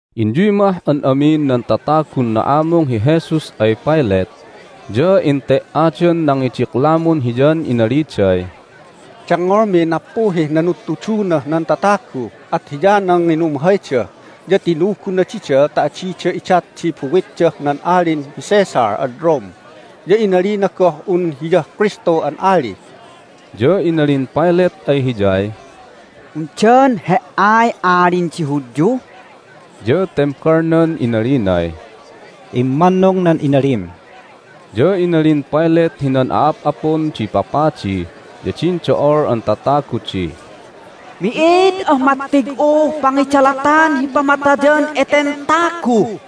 Inyuy mah an amin nan tatagun na'amung hi Jesus ay Pilate, ya ente"adan nangidiklamun Hiyan inaliday, "Dengngolmiy nappuhih nanudtudunah nan tatagu, at hiyanan nginumhayda, ya tinuguna dida ta adida idat di buwitdah nan Alin hi Caesar ad Rome. Ya inalina goh un Hiyah Kristu an ali." Ya inalin Pilate ay Hiyay, "Undan He"ay Alin di Hudyu?" Ya tembalnan inalinay, "Immannung nan inalim." Ya inalin Pilate hinan a'ap'apun di papadi ya din do'ol an tatagu di, "Mi'id ah mattig'uh pangidalatan hi pamatayan eten tagu!"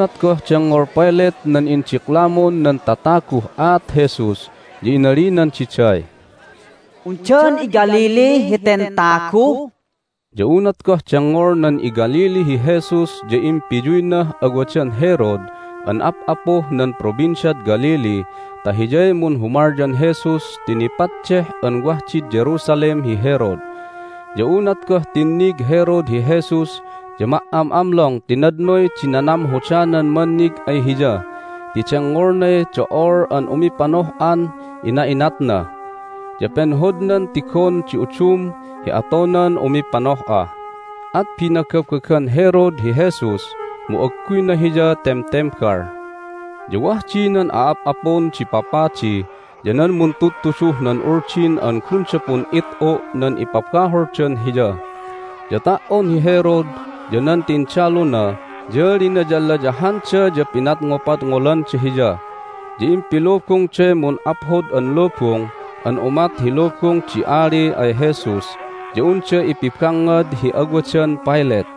Unat goh dengngol Pilate nan indiklamun nan tataguh aat Jesus ya inalinan diday, "Undan iGalilee heten tagu?" Ya unat goh dengngolnan iGalilee hi Jesus ya impiyuynah awadan Herod an ap'apuh nan Provinciad Galilee ta hiyay munhumalyan Jesus ti nipaddeh an wah did Jerusalem hi Herod. Ya unat goh tinnig Herod hi Jesus ya ma"am'amlong ti nadnoy di nanamhodanan mannig ay Hiya ti dengngolnay do'ol an umipanoh'an ina'inatna, ya penhodnan tigon di udum hi atonan umipanoh'a. At binagabagan Herod hi Jesus, mu agguyna hiya temtembal. Ya wah di nan a'ap'apun di papadi ya nan muntudtuduh nan Uldin an gunda pun'it'u' nan ipabaholdan Hiya. Ya ta"on hi Herod ya nan tindaluna ya linayalayahanda ya pinadngopadngolanda Hiya. Ya impilubungday mun'aphod an lubung an umat hi lubung di ali ay Jesus ya unda ipibangngad hi awadan Pilate.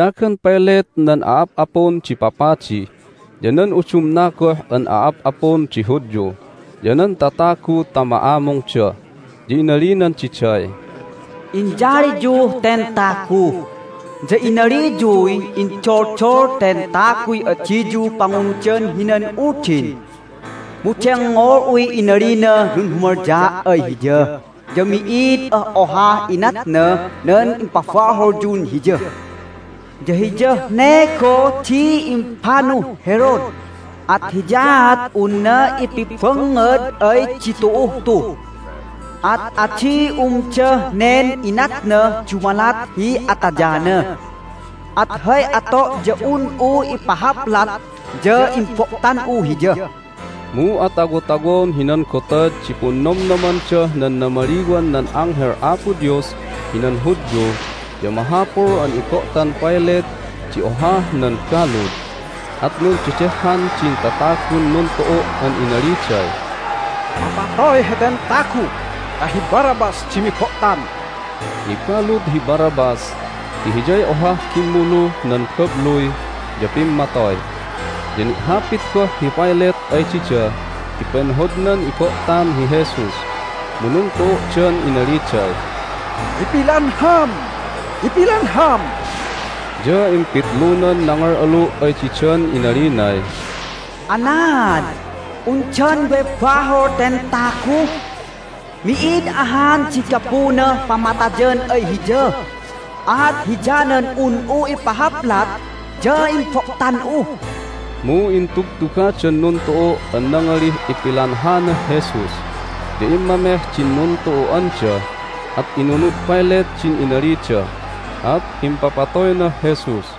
Inayagan Pilate nan a'ap'apun di papadi, ya nan udumna goh an a'ap'apun di Hudyu, ya nan tatagu ta ma'amungda. Ya inalinan diday, "Inyaliyuh ten tagu, ya inaliyuy indoldol ten taguy adiyu pangunudan hinan uldin, mu dengngol'uy inalinah nunhumalyaa' ay Hiya ya mi'id ah ohah inatnah nan impabaholyun Hiya. Ya hiyah ne goh di impanuh Herod, at hiyaat unna ipibangngad ay ditu'uh tu. At adi umdah nen inatnah dumalat hi atayana. At hay ato' ya un'u ipahaplat, ya imbo'tan'u Hiya." (Mu atawotawon hinan Gotad di Punnomnomandah nan Namaliwan nan Anghel Apo Dios hinan Hudyu ya mahapul an ibo'tan Pilate di ohah nan balud.) At nundedehhan din tatagun nuntu'u' an inaliday, "Mapatoy heten tagu ta hi Barabbas di mibo'tan!" (Nibalud hi Barabbas ti hiyay ohah gimmuluh nan babluy, ya pimmatoy.) Ya ni'hapit goh hi Pilate ay dida ti penhodnan ibo'tan hi Jesus. Mu nuntu'u'dan inaliday, "Ipilanham! Ipilanham!" Ya impitlunan nangal'alu' ay didan inalinay, "Anaad? Undan way bahol ten tagu? Mi'id ahan di gapunah pamatayan ay Hiya! At hiyanan un'u ipahaplat, ya imbo'tan'u." Mu intugtugadan nuntu'u' an nangalih ipilanhanah Jesus. Ya immameh din nuntu'u'anda. At inunud Pilate din inalida, at impapatoynah Jesus.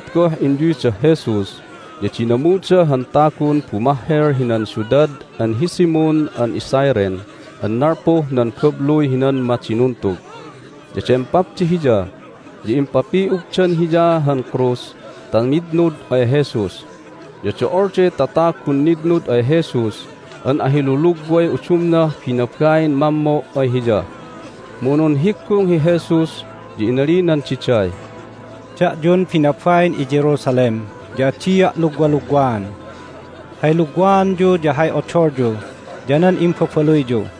Unat goh inyuydah Jesus ya dinamuda han tagun bumahhel hinan siudad an hi Simon an iCyrene an nalpuh nan babluy hinan madinuntug. Ya dempapda hiya, ya impapi'ugdan hiya han krus ta mitnud ay Jesus. Ya do'olday tatagun nitnud ay Jesus an ahilulugway udumnah binabain mammo' ay Hiya. Mu nunhiggung hi Jesus, ya inalinan diday, "Da'yun binabain iJerusalem ya adia' lugwalugwaan. Hay lugwaanyu ya hay odolyu ya nan imbabaluyyu.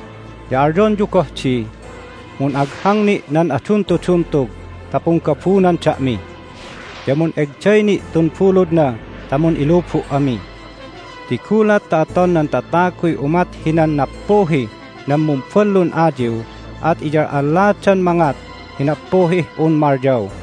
Ya alyonyu goh di, Mun'aghang ni' nan aduntuduntug ta punggabunan da'mi! Ya mun'egday ni' tun buludna ta mun'ilubu' ami! Ti gulat ta aton nan tataguy umat hinan nappuhih nan mumballun ayiw at iyal'alladan mangat hi nappuhih un malyaw!"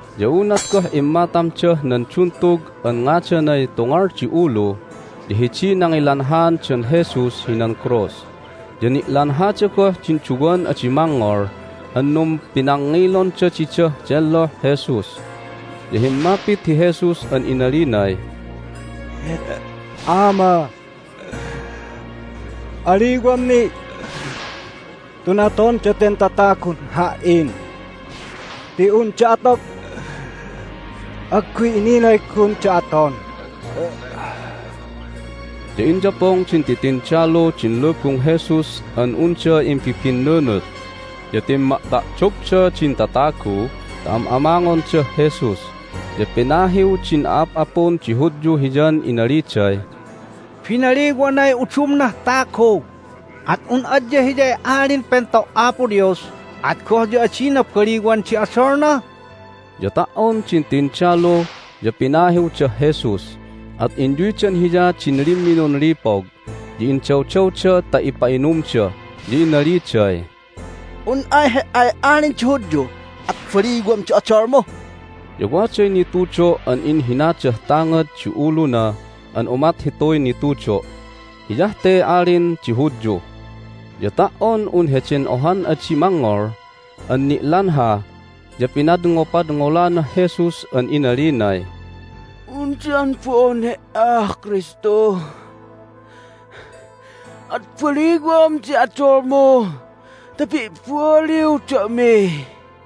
Ya unat goh immatamdah nan duntug an ngadanay Tungal di Ulu ya hidiy nangilanhaandan Jesus hinan krus, ya ni'lanhada goh din duwan adi mangngol an numpinangngilonda didah delloh Jesus. Ya himmapit hi Jesus an inalinay, "Ama, aliwam ni' tun aton daten tatagun Ha"in ti unda atog agguy inilay gunda aton." Ya inyapong din titindalu din lubung Jesus an unda imbibinnunut. Ya timma'ta'dogda din tatagu ta am'amangondah Jesus, ya pinahiw din a'ap'apun di Hudyu Hiyan inaliday, "Binaliwanay udumnah tagu! At un adya Hiyay Alin Pento' Apo Dios at goh ya adina baliwan di odolna?" Ya ta"on din tindalu ya pinahiwdah Jesus, at inyuydan Hiya din limminun lipog, ya indawdawda ta ipa'inumda, ya inaliday, "Un ay He"ay Alin di Hudyu at baliwam di odolmu!" Ya waday nitudo' an inhinadah tangad di uluna an umat hituy nitudo': "Hiyah te Alin di Hudyu." Ya ta"on un heden ohan adi mangngol an ni'lanha ya pinadngopadngolanah Jesus an inalinay, "Undan bo'on He"ah Kristu? At baliwan di odolmu ta pi'baliw da'mi!"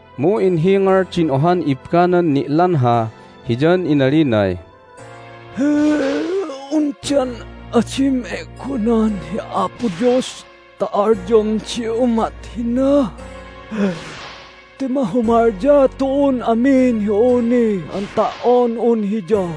Mu inhingal din ohan ibbanan ni'lanha hiyan inalinay, "Undan adim e'gonan hi Apo Dios ta alyomdi umat hina? Ti mahumalya tu'un amin hi awni an ta"on un Hiya,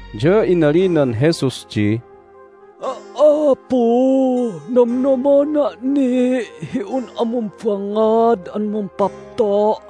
Ya inalinan Jesus di, "Apu, nomnomona' ni' hi un'a mumbangngad an mumpapto'."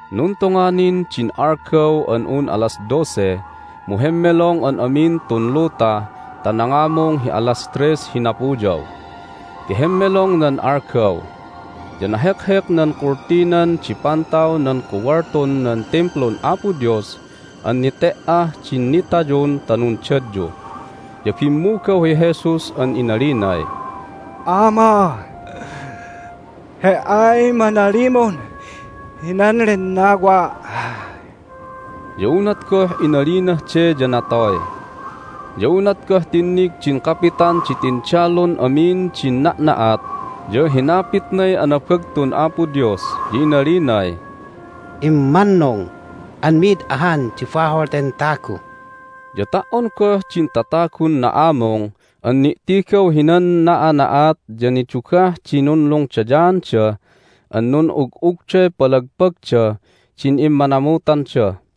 Nuntonga nin din algaw an un alas dose, mu hemmelong an amin tun luta ta nangamung hi alas tres hi napuyaw ti hemmelong nan algaw. Ya nahekhek nan kultinan di pantaw nan kuwaltun nan Timplun Apo Dios an nete"ah din nitayun ta nundadyu. Ya bimmugaw hi Jesus an inalinay, "Ama, He"ay manalimun hinan lennawa'!" Ya unat goh inalinah de ya natoy. Ya unat goh tinnig din kapitan di tindalun amin din na'na'at ya hinapitnay anabagtun Apo Dios, ya inalinay, "Immannung an mi'id ahan di bahol ten tagu!" Ya ta"on goh din tatagun na'amung an ni'tigaw hinan na'ana'at ya nidugah di nunlungdayaanda an nun'ug'ugday palagpagdah din immanamutanda.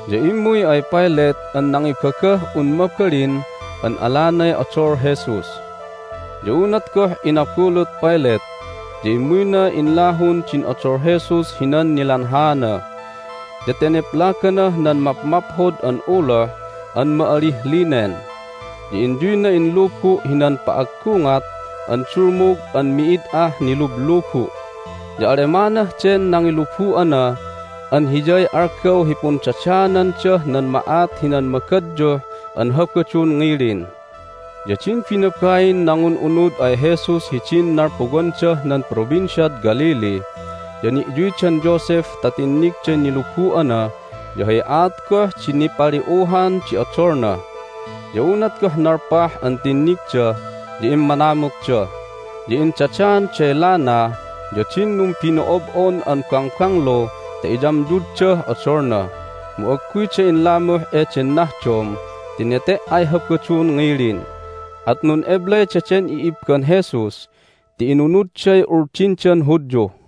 Ya immuy ay Pilate an nangibagah un mabalin an alanay odol Jesus. Ya unat goh inabulut Pilate ya immuyna inlahun din odol Jesus hinan nilanhaana, ya teneplaganah nan mapmaphod an uloh an ma'alih linen, ya inyuyna inlubu' hinan pa'aggungat an dulmug an mi'id ah nilublubu'. Ya Alemanah den nangilubu'ana an hiyay algaw hi pundadaanandah nan ma'at hinan magadyuh an Habadun ngilin. Ya din binabain nangun'unud ay Jesus hidin nalpuwandah nan Provinciad Galilee ya ni'yuydan Joseph ta tinnigday nilubu'ana ya hay aat goh di nipali'uhan di odolna. Ya unat goh nalpah an tinnigda ya immanamutda, ya indadaanday lana ya din numbino'ob'on an bangbanglu ta iyamyuddah odolna. Mu agguyda inlamuh eden nahdom ti nete"ay Habadun ngilin, at nun'eblay daden i'ibban Jesus ti inunudday Uldindan Hudyu.